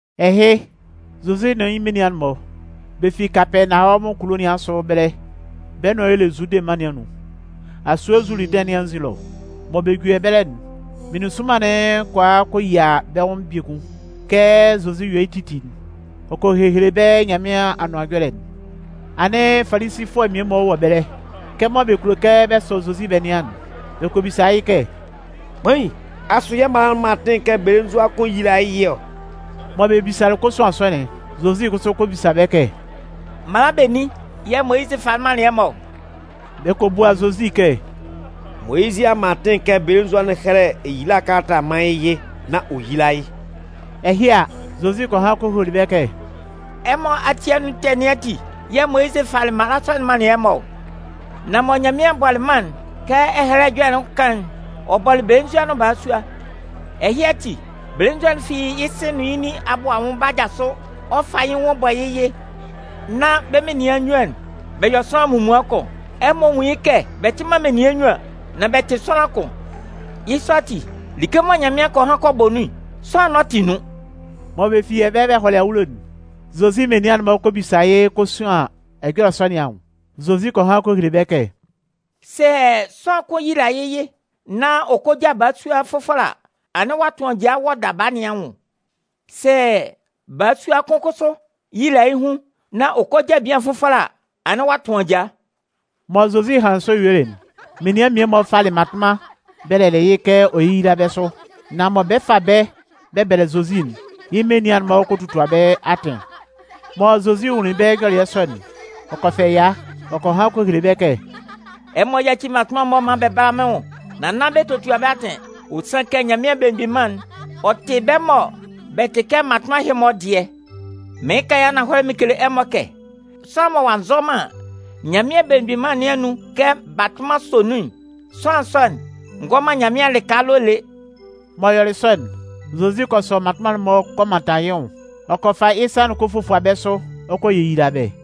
Ɛhɩ, Zozi nʋn yɩ́ menian'n-mɔ, bɛ fi Kapɛɛnawɔmʋn kulo nɩn asʋ ɛbɛlɛ bɛ́ nʋan y'ɔ le Zude mân nɩn anun, asue Zuludɩn nɩn anzin ɛlɔ. Mɔ bɛ juli ɛbɛlɛ'n, meninsʋnman'n kɔ a kɔ yia bɛ́ nwʋn biekun. Kɛ Zozi yɔ yɩ́ titi'n, ɔ kɔ hehele bɛ́ Nyanmɩan Anʋan Ɛjɔlɛ'n. Anɩn Falisifʋɛ mmie-mɔ wɔ ɛbɛlɛ. Kɛmɔ bɛ kulo kɛ bɛ sɔ Zozi bɛ nɩan'n, bɛ kɔ bisa yɩ́ kɛ: “Kpain, asʋ yɛ́ mala'n man atɩn kɛ belenzua kʋn yíla yɩ́ yɩ ɔ?” Mɔ bɛ bisalɩ kosuan sɔ'n, Zozi kʋsʋ kɔ bisa bɛ́ kɛ: “Mala benin yɛ̂ Moyizɩ falɩ manlɩn ɛmɔ ɔ?” Bɛ kɔ bua Zozi kɛ: “Moyizɩ a man atɩn kɛ belenzua'n hɛ́lɛ eyila kalata mán yɩ́ yɩ nán ɔ yíla yɩ́.” Ɛhɩ a, Zozi kɔ han kɔ hele bɛ́ kɛ: “Ɛmɔ ati anun ɛtɛ nɩn ati yɛ̂ Moyizɩ falɩ mala sɔ'n manlɩn ɛmɔ ɔ. Nan mɔ Nyanmɩan bɔlɩ mân'n, kɛ Ɛhɛlɛ Ɛjɔlɛ'n kan'n: Ɔ bɔlɩ belenzua nʋn balasua. Ɛhɩ ati, belenzua'n fi yɩ́ sɩ nʋn yɩ́ nin abʋ anwʋn 'ba jasʋ. Ɔ 'fa yɩ́ nwʋn bɔ yɩ́ yɩ, nán bɛ́ munnyuan'n bɛ yɔ sʋanlan munmuan kʋn. Ɛmɔ nwún yɩ́ kɛ bɛ tɩ man menian nnyuan, nan bɛ tɩ sʋanlan kʋn. Yɩ́ sɔ ati, like mɔ Nyanmɩan kɔ han kɔ bɔ nun'n, sʋanlan n'ɔ tɩ nun.” Mɔ bɛ fi ɛbɛlɛ bɛ hɔlɩ awulo'n, Zozi menian'n-mɔ kɔ bisa yɩ́ kosuan ɛjɔlɛ sɔ nɩn anwʋn. Zozi kɔ han kɔ hele bɛ́ kɛ: “Sɛ sʋanlan kʋn yila yɩ́ yɩ nán ɔ kɔ ja balasua fʋfɔlɛ a, anɩn ɔ'a tʋn ajaa wɔ daba nɩn anwʋn. Sɛ balasua kʋn kʋsʋ yila yɩ́ hun nán ɔ kɔ ja belenzua fʋfɔlɛ a, anɩn ɔ'a tʋn ajaa.” Mɔ Zozi hanlɩn sɔ yuelɩ'n, menian mmie-mɔ falɩ mmatʋnman bɛlɛlɩ yɩ́ kɛ ɔ yéyila bɛ́ sʋ. Nan mɔ bɛ 'fa bɛ́ bɛ bɛlɛ Zozi'n, yɩ́ menian'n-mɔ kɔ totua bɛ́ atɩn. Mɔ Zozi nwunlin bɛ́ nyɔlɩɛ sɔ'n, ɔ kɔ fɛ ɛya. Ɔ kɔ han kɔ hele bɛ́ kɛ: “Ɛmɔ yáci mmatʋnman'n-mɔ maan bɛ bála mɩ́n nwʋn, nan nán bɛ totua bɛ́ atɩn. Ɔ sanlɩn kɛ Nyanmɩan Belemgbin Mân'n, ɔ tɩ bɛ́ mɔ bɛ tɩ kɛ mmatʋnman ɛhɩ-mɔ'n dɩɛ. Mɩɩn kan yɩ́ ananhɔlɛ mɩn kele ɛmɔ kɛ, sʋanlan mɔ ɔ'a nzɔ man Nyanmɩan Belemgbin Mân nɩn anun kɛ batʋnman sɔ nun'n, sʋanlan sɔ'n ngɔ man Nyanmɩan lɩka ɛlɔ lé.” M'ɔ yɔlɩ sɔ'n, Zozi kɔ sɔ mmatʋnman'n-mɔ kɔ mantan yɩ́ nwʋn. Ɔ kɔ fa yɩ́ sa'n kɔ fofua bɛ́ sʋ ɔ kɔ yeyila bɛ́.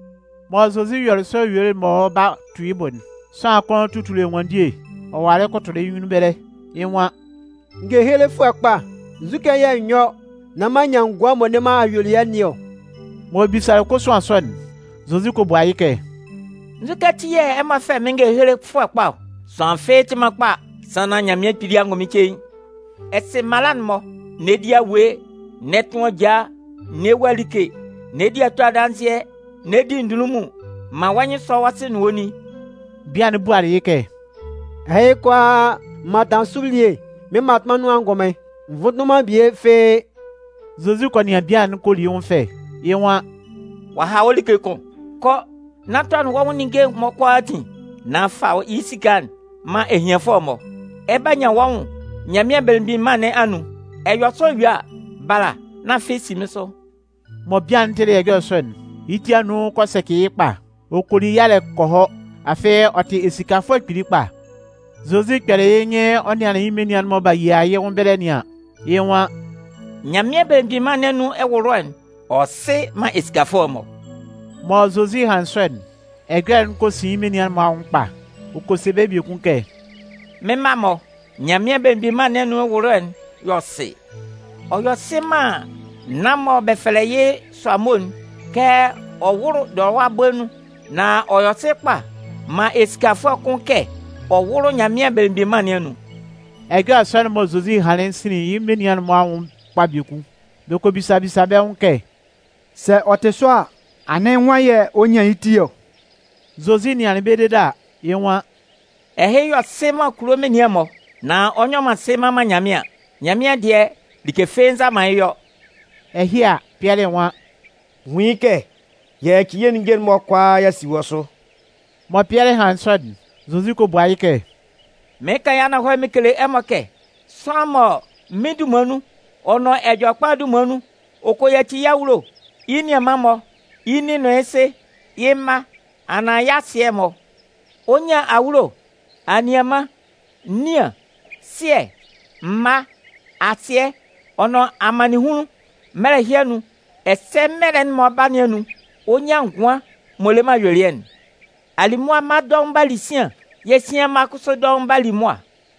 Mɔ Zozi yɔlɩ sɔ yuelɩ mɔ ɔ 'ba tu yɩ́ bʋ'n, sʋanlan kʋn tutuli ɛnwanndie ɔ walɩ kʋtʋlɩ yɩ́ nyunnun ɛbɛlɛ. Yɩ́ nwan: “Ngehelefʋɛ kpa, nzukɛ yɛ̂ n yɔ́ nán m'an nyan ngʋan m'ɔ le man ayuelɩɛ nɩn ɔ?” M'ɔ bisalɩ kosuan sɔ'n, Zozi kɔ bua yɩ́ kɛ: “Nzukɛ ati yɛ̂ ɛ fɛlɛ mɩ́n ngehelefʋɛ kpa ɔ? Sʋanlan fɩ́ɩ́ tɩ man kpa sannan Nyanmɩan Kpili angʋnmɩn cein. Ɛ sɩ mala'n-mɔ: N'ɛ di awue, n'ɛ tʋn ajaa, n'ɛ wua like, n'ɛ di ato adanzɩɛ, n'ɛ di ndunlunmun, man wɔ́ nyɩn sɔ́ wɔ́ sɩ nʋn wɔ́ nin.” Bian'n bualɩ yɩ́ kɛ: “Ɛhɩ kʋalaa m mantanlɩn sʋ elie mɩ́n mmatʋnman nun angʋnmɩn. N vʋnndʋnlɩn man bie fɩ́ɩ́.” Zozi kɔ nɩan bian'n ɔ kɔ li yɩ́ nwʋn fɛ. Yɩ́ nwan: “Ɔ a ha wɔ́ like kʋn. Kɔ nán tɔnɩn wɔ́ nwʋn ninnge'n-mɔ kʋalaatin, nán fa yɩ́ esika'n man ehianfʋɛ'n-mɔ. Ɛ 'ba nyan wɔ́ nwʋn Nyanmɩan Belemgbin Mân nɩn anun. Ɛ yɔ sɔ yue a, bala, nán afɩ si mɩ́n sʋ.” Mɔ bian'n tɩlɩ ɛjɔlɛ sɔ'n, yɩ́ ti anun kɔ sɛcɩ yɩ́ kpa. Ɔ kɔ li yalɛ kɔ hɔ, afɩ ɔ tɩ esikafʋɛ kpili kpa. Zozi kpɛlɩ yɩ́ nyɩn ɔ nɩanlɩn yɩ́ menian'n-mɔ mɔ b'a yia yɩ́ nwʋn ɛbɛlɛ nɩn an, yɩ́ nwan: “Nyanmɩan Belemgbin Mân nɩn anun ɛwʋlʋɛ'n, ɔ yɔ sɩ man esikafʋɛ'n-mɔ!” Mɔ Zozi hanlɩn sɔ'n, ɛjɔlɛ'n kɔ sin yɩ́ menian'n-mɔ anwʋn kpa. Ɔ kɔ se bɛ́ biekun kɛ: “Mɩ́n mma-mɔ, Nyanmɩan Belemgbin Mân nɩn anun ɛwʋlʋɛ'n yɔ sɩ! Ɔ yɔ sɩ man naan'n mɔ bɛ fɛlɛ yɩ́ sʋamo'n kɛ ɔ wʋ́lʋ dɔlɔwa bɔɛ nun. Nan ɔ yɔ sɩ kpa man esikafʋɛ kʋn kɛ ɔ wʋ́lʋ Nyanmɩan Belemgbin Mân nɩn anun.” Ɛjɔlɛ sɔ'n mɔ Zozi hanlɩn'n sinlin yɩ́ menian'n-mɔ anwʋn kpa biekun. Bɛ kɔ bisa bisa bɛ́ nwʋn kɛ: “Sɛ ɔ tɩ sɔ a, anɩn nwan yɛ̂ ɔ 'nyan yɩ́ ti ɔ?” Zozi nɩanlɩn bɛ́ dede a, yɩ́ nwan: “Ɛhɩ yɔ sɩ man kulo menian'n-mɔ, nan ɔ nyɔ sɩ mman man Nyanmɩan. Nyanmɩan dɩɛ, like fɩ́ɩ́ nza man yɩ́ yɔ.” Ɛhɩ a, Pɩɛlɩ nwan: “Nwun yɩ́ kɛ y'a yaci yɛ́ ninnge'n-mɔ kʋalaa y'a si wɔ́ sʋ.” Mɔ Pɩɛlɩ hanlɩn sɔ'n, Zozi kɔ bua yɩ́ kɛ: “Mɩɩn kan yɩ́ ananhɔlɛ mɩn kele ɛmɔ kɛ sʋanlan mɔ mɩ́n dunman nun ɔ nʋn Ɛjɔlɛkpa'n dunman nun ɔ kɔ yaci yɩ́ awulo, yɩ́ nianman'n-mɔ, yɩ́ nin nʋn yɩ́ sɩ, yɩ́ mma, anaan yɩ́ asɩɛ'n-mɔ, ɔ 'nyan awulo, anianman, nian, sɩɛ, mma, asɩɛ, ɔ nʋn amannɩnhunlun mɛlɛ ɛhɩ anun, ɛsɛ mɛlɛ'n m'ɔ lɛ ba nɩn anun, ɔ 'nyan ngʋan m'ɔ le man ayuelɩɛ'n. Alimʋa mma'n-mɔ dɔʋn 'ba li sian, yɛ̂ sian mma'n-mɔ kʋsʋ dɔʋn 'ba li mʋa.”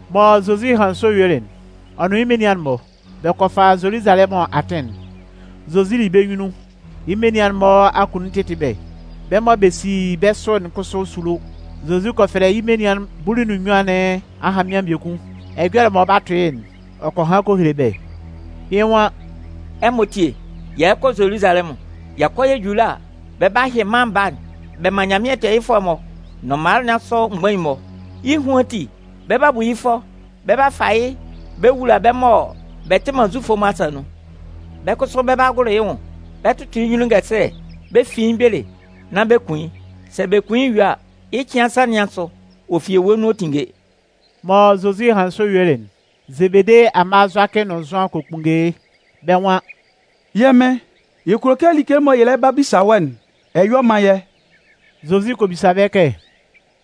Mɔ Zozi hanlɩn sɔ yuelɩn'n, ɔ nʋn yɩ́ menian'n-mɔ, bɛ kɔ fa Zoluzalɛmʋn atɩn'n. Zozi li bɛ́ nyunnun. Yɩ́ menian'n-mɔ akunnun tɩtɩ bɛ́. Bɛ́ mɔ bɛ si bɛ́ sʋ'n kʋsʋ sulo. Zozi kɔ fɛlɛ yɩ́ menian bulu nʋn nnyuan nɩn ahanmɩan biekun. Ɛjɔlɛ'n mɔ ɔ 'ba tʋ yɩ́'n, ɔ kɔ han kɔ hele bɛ́. Yɩ́ nwan “Ɛmɔ tíe, yɛ lɛ kɔ Zoluzalɛmʋn! Yɛ kɔ yɛ ju ɛlɔ a, bɛ 'ba hyɩ Mân Baa'n bɛ man Nyanmɩan tɛɛyɩfʋɛ'n-mɔ nʋn mala nɩn asʋ mgbain'n-mɔ. Yɩ́ ehuan ati, bɛ 'ba bu yɩ́ fʋɔ. Bɛ 'ba fa yɩ́ bɛ wula bɛ́ mɔ bɛ tɩ man Zufʋ'n-mɔ asa nun. Bɛ́ kʋsʋ bɛ 'ba gʋlʋ yɩ́ nwʋn, bɛ tʋtʋ yɩ́ nyunnun ngɛsɛlɛ, bɛ fin yɩ́ mgbele nán bɛ kun yɩ́. Sɛ bɛ kun yɩ́ yue a, yɩ́ cɩan nsan nɩn asʋ, ɔ fi ewue nun ɔ 'tinnge.” Mɔ Zozi hanlɩn sɔ yuelɩ'n, Zebede amma Zʋakɩ nʋn Zʋan kɔ kpunnge yɩ́. Bɛ́ nwan: “Yɛ́ Mɩn, yɛ kulo kɛ like'n mɔ yɛ lɛ ba bisa wɔ́'n, ɛ yɔ́ man yɛ́”. Zozi kɔ bisa bɛ́ kɛ: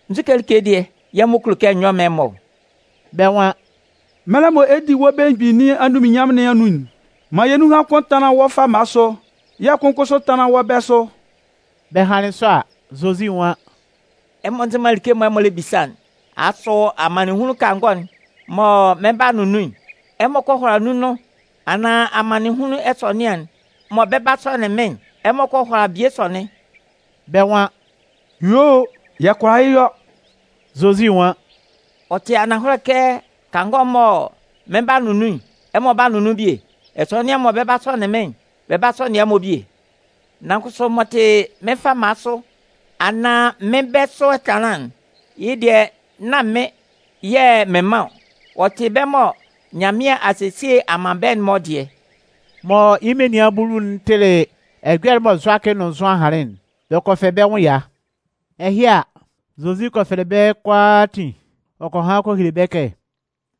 “Nzu like dɩɛ yɛ̂ ɛmɔ kulo kɛ n yɔ́ m mán ɛmɔ ɔ?” Bɛ́ nwan: “Mɛlɛ mɔ ɛ 'di wɔ́ belemgbin nɩn anunminnyanmʋn nɩn anun'n, man yɛ́ nunhan kʋn tánlan wɔ́ fama sʋ yɛ̂ kʋn kʋsʋ tánlan wɔ́ bɛ̂ sʋ.” Bɛ hanlɩn sɔ a, Zozi nwan: “Ɛmɔ nzɩ man like'n mɔ ɛmɔ lɛ bisa'n. Asʋ amannɩnhunlun kangɔ'n mɔ mɩn 'ba nʋn nun'n, ɛmɔ kɔ hʋala nun nʋn? Anaan amannɩnhunlun ɛsɔnɩan'n mɔ bɛ 'ba sɔnɩn mɩ́n'n, ɛmɔ kɔ hʋala bie sɔnɩn?” Bɛ́ nwan: “Yuo o, yɛ kʋala yɩ́ yɔ.” Zozi nwan: “Ɔ tɩ ananhɔlɛ kɛ kangɔ'n mɔ mɩn 'ba nʋn nun'n, ɛmɔ 'ba nʋn nun bie. Ɛsɔnɩan'n mɔ bɛ 'ba sɔnɩn mɩ́n'n, bɛ 'ba sɔnɩn ɛmɔ bie. Nan kʋsʋ m'ɔ tɩ mɩ́n fama sʋ anaan mɩ́n bɛ̂ sʋ ɛtanlán'n, yɩ́ dɩɛ nán mɩ́n yɛ̂ mɩn man ɔ. Ɔ tɩ bɛ́ mɔ Nyanmɩan a sesie a man bɛ́'n-mɔ dɩɛ.” Mɔ yɩ́ menian bulu'n tɩlɩ ɛjɔlɛ'n mɔ Zʋakɩ nʋn Zʋan hanlɩn'n, bɛ kɔ fɛ bɛ́ nwʋn ɛya. Ɛhɩ a, Zozi kɔ fɛlɛ bɛ́ kʋalaatin ɔ kɔ han kɔ hele bɛ́ kɛ: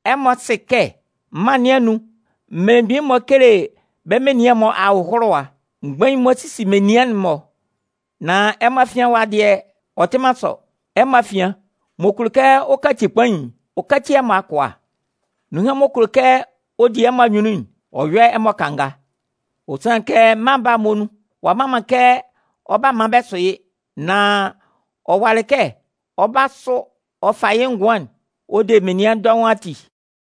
“Ɛmɔ sɩ kɛ mân nɩn anun mmelemgbin'n-mɔ kele bɛ́ menian'n-mɔ ahʋlʋwa. Mgbain'n-mɔ sisi menian'n-mɔ. Nan ɛmɔ afian ɛwa dɩɛ, ɔ tɩ man sɔ. Ɛmɔ afian, m'ɔ kulo kɛ ɔ kaci kpain'n, ɔ káci ɛmɔ akʋa. Nunhan m'ɔ kulo kɛ ɔ di ɛmɔ anyunnun'n, ɔ yɔ́ ɛmɔ kanga. Ɔ sanlɩn kɛ Mân Baa'n muonun, ɔ'a mma man kɛ ɔ 'ba maan bɛ sʋ yɩ́. Nan ɔ walɩ kɛ ɔ 'ba sʋ ɔ fa yɩ́ ngʋan'n ɔ de menian dɔʋn ati.”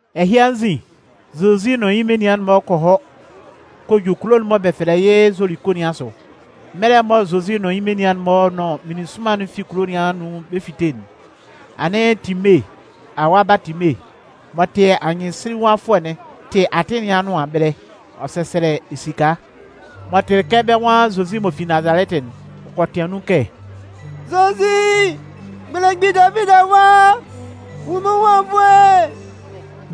Ɛhɩ anzin, Zozi nʋn yɩ́ menian'n-mɔ kɔ hɔ kɔ ju kulo'n mɔ bɛ fɛlɛ yɩ́ Zoliko nɩn asʋ. Mɛlɛ mɔ Zozi nʋn yɩ́ menian'n-mɔ nʋn meninsʋnman'n fi kulo nɩn anun bɛ 'fite'n, anɩn Time awa Baatime m'ɔ tɩ anyɩnsinlinwafʋɛ'n tɩ atɩn nɩn anʋan ɛbɛlɛ. Ɔ sɛsɛlɛ esika. M'ɔ tɩlɩ kɛ bɛ́ nwan Zozi m'ɔ fi Nazalɛtɩ'n, ɔ kɔ tɩan nun kɛ: “Zozi, belemgbin Davidi Awa, nwun mɩ́n nwʋn anwunnvoe!”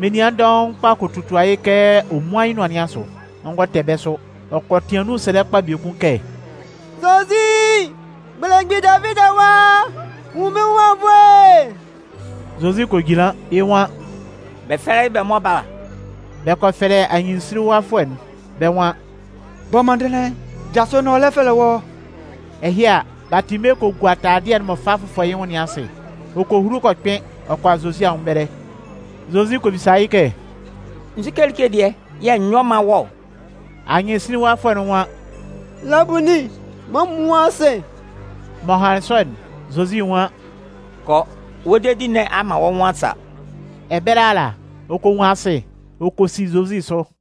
Menian dɔʋn kpa kɔ totua yɩ́ kɛ ɔ múan yɩ́ nʋan nɩn asʋ. Ɔ ngɔ tɛ bɛ́ sʋ. Ɔ kɔ tɩan nun sɛlɛ kpa biekun kɛ: “Zozi, belemgbin Davidi Awa, nwun mɩ́n nwʋn anwunnvoe!” Zozi kɔ jinlan. Yɩ́ nwan: “Bɛ fɛ́lɛ yɩ́ bɛ mán ɔ bála.” Bɛ kɔ fɛlɛ anyɩnsinlinwafʋɛ'n, bɛ́ nwan: “Bɔ mɔndɩnlɩn, jasʋ nán ɔ lɛ fɛlɛ wɔ́.” Ɛhɩ a, Baatime kɔ gua taladɩɛ'n m'ɔ fa fʋfɔ yɩ́ nwʋn nɩn asɩ. Ɔ kɔ hulu kɔ kpɩn ɔ kɔ a Zozi anwʋn ɛbɛlɛ. Zozi kɔ bisa yɩ́ kɛ: “Nzu like dɩɛ yɛ̂ n yɔ́ m mán wɔ́ ɔ?” Anyɩnsinlinwafʋɛ'n nwan: “Labunin, man n nwún asɩ.” M'ɔ hanlɩn sɔ'n, Zozi nwan: “Kɔ, wɔ́ dedi nɩn a man wɔ́ nwʋn a sa.” Ɛbɛlɛ ala, ɔ kɔ nwun asɩ. Ɔ kɔ si Zozi sʋ.